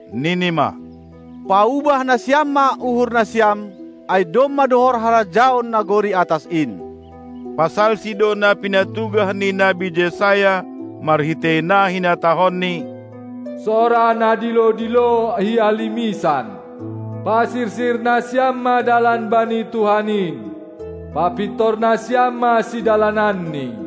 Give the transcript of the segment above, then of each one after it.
nini ma: Paubah nasiam ma uhur nasiam, ai domma dohor harajaon nagori atas in! Pasalsi do na pinatugah ni nabi Jesaya marhitei na hinatahonni: Sora na dilo-dilo i halimisan! Pasirsir nasiam ma dalan bani Tuhan in; papintor nasiam ma sidalananNi!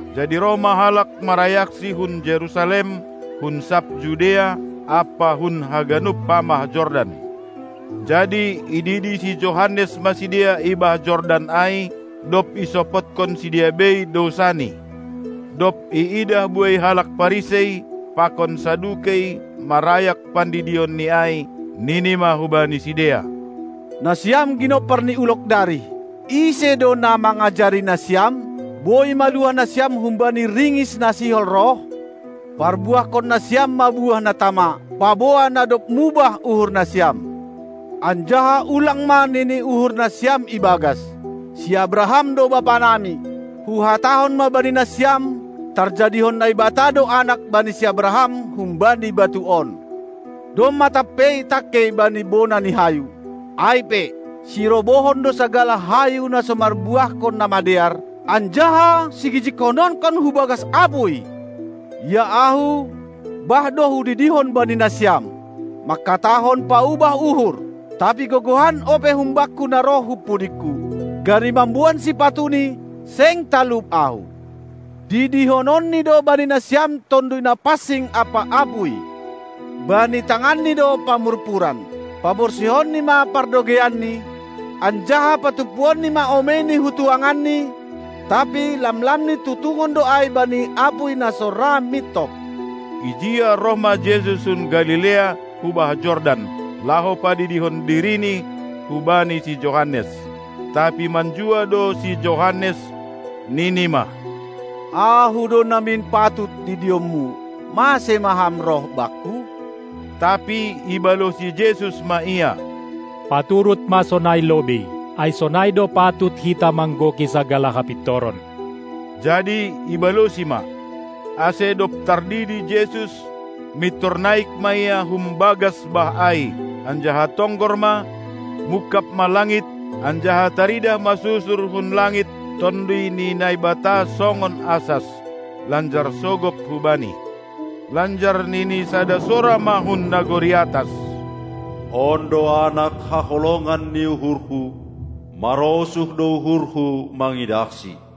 Jadi roh ma halak marayaksi hun Jerusalem, hun sab Judea ampa hun haganup pamah Jordan. Jadi ididi si Johannes ma sidea i bah Jordan ai, dob isopotkon sidea bei dousani. Dob iidah buei halak Parisei pakon Sadukei marayak pandidionni ai, nini ma hubani sidea: Nasiam ginompar ni ulog darih! Ise do na mangajari nasiam, boi maluah nasiam humbani ringis na sihol roh? Parbuahkon nasiam ma buah na tama, paboa na dob mubah uhur nasiam, anjaha ulang ma nini uhur nasiam ibagas: Si Abraham do bapanami! Huhatahon ma bani nasiam: Tarjadihon Naibata do anak bani si Abraham humbani batu on. Domma tampei tangkei bani bona ni hayu. Ai pe, sirobohon do sagala hayu na so marbuahkon na madear, anjaha sigijigkononkon hu bagas apuy! Ia ahu, bah do hudidihon bani nasiam, mangkatahon paubah uhur, tapi gogohan ope humbakku na roh hun pudingku, gari mamboan sipatuni seng talup ahu. Didihononni do bani nasiam Tonduy Napansing ampa apuy. Bani tanganNi do pamurpuran, paborsihonNi ma pardogeianNi, anjaha patumpuonNi ma omeiNi hu tuanganNi, tapi lamlamNi tutungon do ai bani apuy na so ra mintop. Ijia roh ma Jesus hun Galilea hu bah Jordan, laho padidihon diriNi hubani si Johannes. Tapi manjua do si Johannes, nini ma: Ahu do namin patut didion-Mu, mase ma Ham roh bakku? Tapi ibalosi Jesus ma ia: Paturut ma sonai lobei, ai sonai do patut hita manggoki sagala hapintoron! Jadi ibalosi ma. Ase dob tardidi Jesus, mintor naik ma Ia hum bagas bah ai. Anjaha tonggor ma, mungkab ma langit, anjaha taridah ma susur hun langit Tonduy ni Naibata songon asas, lanjar sogop hu Bani. Lanjar nini sada sora ma hun nagori atas: On do Anak, haholongan ni uhur-Hu, marosuh do uhur-Hu mangidahSi!